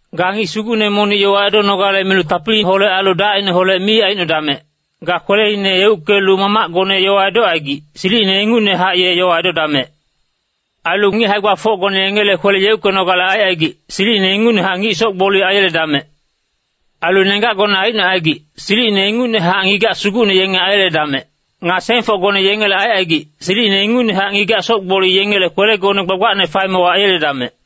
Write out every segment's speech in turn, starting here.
Ga ngic sugucne monic yowa edonogale milu tapiliholec ailu dacineholec mi aicnodamec, ga kweleine yeuckelu mamacgone yowa edocaigic, silicine ingucnehac ye yowa edodamec. Ailu ngic hae-gbafocgone yengele kwele yeuckenogale aicaigic, silicine ingucnehac ngic soc-gboli aiyeledamec. Ailu nenggacgone aicnocaigic, silicine ingucnehac ngigac sugucne yenge aiyeledamec. Nga sengfocgone yengele aicaigic, silicine ingucnehac ngigac soc-gboli yengele kwelegone gbagbacne faemewa aiyeledamec.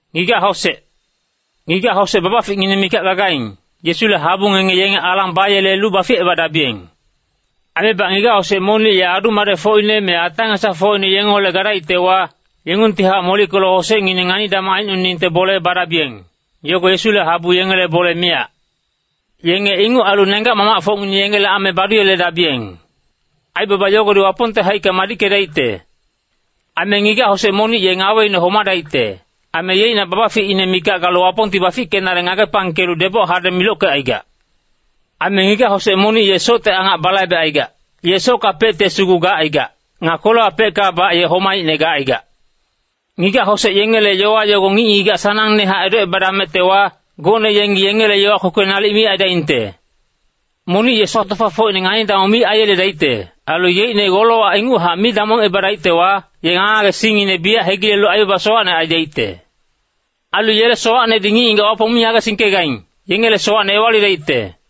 Ngigac-hosec babaficngineng mikac gagaing, Yesule habu ngenge yenge alang bayelelu baficebadabiyeng. Aimebac ngigac-hosec monic ye adu-madecfocine me ata-ngesafocine yengeholec gadaictewa, yengungtihac molickelu hosecngineng ngani-damong aicnoningte bole badabiyeng. Yogo Yesule habu yengele bole miyac. Yenge inguc ailu nenggac-mamacfocngineng yengele ame baduyeledabiyeng. Aibaba yogodi Wapongte haicka madickedaicte. Aime ngigac-hosec monic ye ngaweine homadaicte, aime yeicnac babaficine mikac galu Wapongti bafickenale ngagepangkelu deboc hadeng milockecaigac. Aime ngigac-hosec monic ye socte angac balaibecaigac, ye sockapecte sugu gacaigac. Nga kwelewapeckabac ye homaicne gacaigac. Ngigac-hosec yengele yowa yogo ngic-ngigac sanangnehac edocebadamectewa, gocne yengi yengela kpokpolic nalic mi aidaingte. Monic ye sac-tofafocine ngani-damong mi aiyeledaicte. Ailu yeicne golowac inguchac mi damongebadaictewa, ye ngage-ngagesingngine biyac hegilelu aibaba sowacne aidaicte. Ailu yele sowacnedi ngic-ngigac Wapong mi ngagesingkegaing, yengele sowacne ewalidaicte.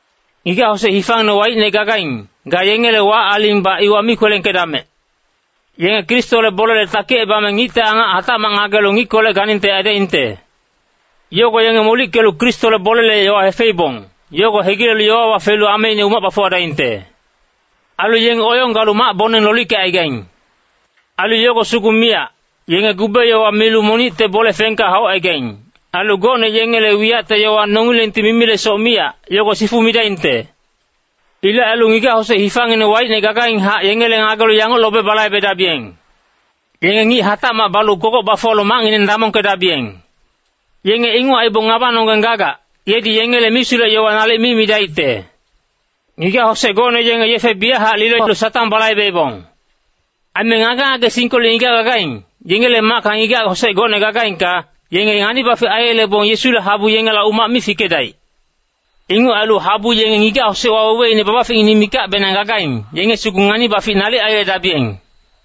Ngigac-hosec hifangineng waicne gagaing, ga yengele wac-alingbac iwa mi kwelengkedamec. Yenge Kristole bolele takicebame ngicte angac hatacmac ngagelu ngickolec ganingte aidaingte. Yogo yenge molickelu Kristole bolele yowa hefeibong, yogo hegilelu yowawa felu ameine umac bafuwadaingte. Ailu yenge oyong galu mac-boneng lolickecaigaing. Ailu yogo sugu miyac, yenge gube yowa milu monicte bole fengka haucaigaing. Ailu gocne yengele wiyacte yowa nongilengti mimilesoc miyac, yogo sifu midaingte. Ilec ailu ngigac-hosec hifangineng waicne gagainghac yengele ngagelu yanguc lobe balaibedabiyeng. Yenge ngic hatacmac balu kogoc bafuwalu macngineng damongkedabiyeng. Yenge inguc aibong ngabanonggeng gagac, yedi yengele misulec-yowa nalic mi midaicte. Ngigac-hosec gocne yenge yefe biyachac lilolu Satang balaibeibong. Aime ngage-ngagesingkolec ngigac gagaing, yengele macka ngigac-hosec gocne gagaingka, yenge ngani-bafic aiyelebong Yesule habu yengela umac mi fikedaic. Inguc ailu habu yenge ngigac-hosec waweweine babaficngineng mikacbenang gagaing, yenge sugu ngani-bafic nalic aiyeledabiyeng.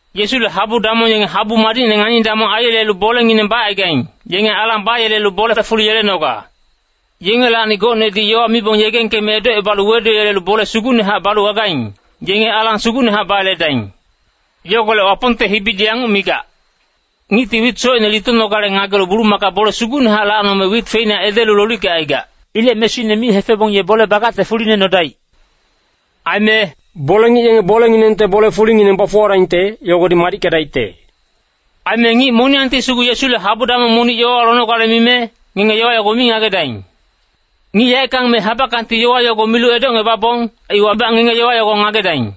Yesule habu damong yenge habu madicne ngani-damong aiyelelu bolengineng bacaigaing, yenge alang bayelelu bolele fuli yelenoga. Yengelacni gocnedi yowa mibong yegengkeme edocebalu weduyelelu bole sugucnehac balu gagaing, yenge alang sugucnehac bayeledaing. Yogolec Wapongte hibidi yanguc migac, “Ngicti wit socine litonogale ngagelu bulumaka bole sugucnehac lacnome wit feina edelu lolickecaigac. Ilec mesuine mi hefebong ye bole bagacte fuline nodaic.” Aime “Bole-ngic yenge bolenginengte bole-fulingineng bafuwadaingte, yogodi madickedaicte.” Aime ngic moniyangti sugu Yesule habu damong monic yowawa lonogale mime, ngenge yowa yogo mi ngagedaing. Ngic yaeckang me habackangti yowa yogo milu edocngebabong, iwabac ngenge yowa yogo ngagedaing.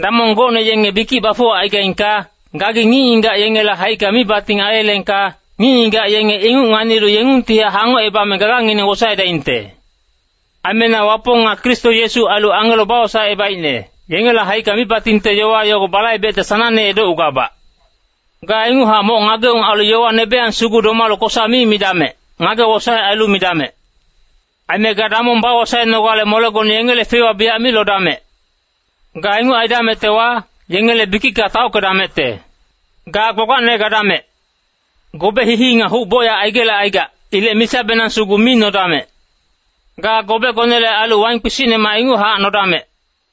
Damong gocne yenge bikic bafuwacaigaingka, gagi ngic-ngigac yengele haicka mibating aiyeleengka, ngic-ngigac yenge inguc nganilu yengungtihac hangocebame gagangineng wosaedaingte. Aime na Wapong nga Kristo Yesu ailu angelo bawosaecebaicne, yengele haicka mibatingte yowa yogo balaibecte sanangne edocgugabac. Ga inguchac moc ngageung ailu nebeyang sugu domalu yowa kosa mi midamec, ngage-wosaec ailu midamec. Aime ga damong bawosaenogale molegone yengele feiwa biyac mi lodamec. Ga inguc aidamectewa, yengele bikicka taockedamecte. Ga gbagbacne gadamec. Gobe hii-hii nga huc bocyac aigelecaigac. Ilec misabenang sugu mi nodamec. Ga gobegonele ailu waing kpisicnemac inguchac nodamec.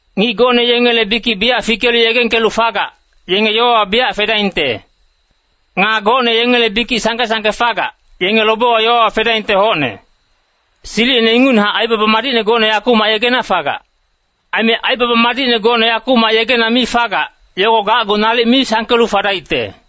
Ngic gocne yengele bikic biyac fikelu yegengkelu fagac, yenge yowawa biyac fedaingte. Nga gocne yengele bikic sangke-sangke fagac, yenge lobewa yowawa fedaingte hocne. Silicine ingucnehac aibaba madicne gocne yakumac yegena fagac. Aime aibaba madicne gocne yakumac yegena mi fagac, yogo gacgu nalic mi sangkelu fadaicte.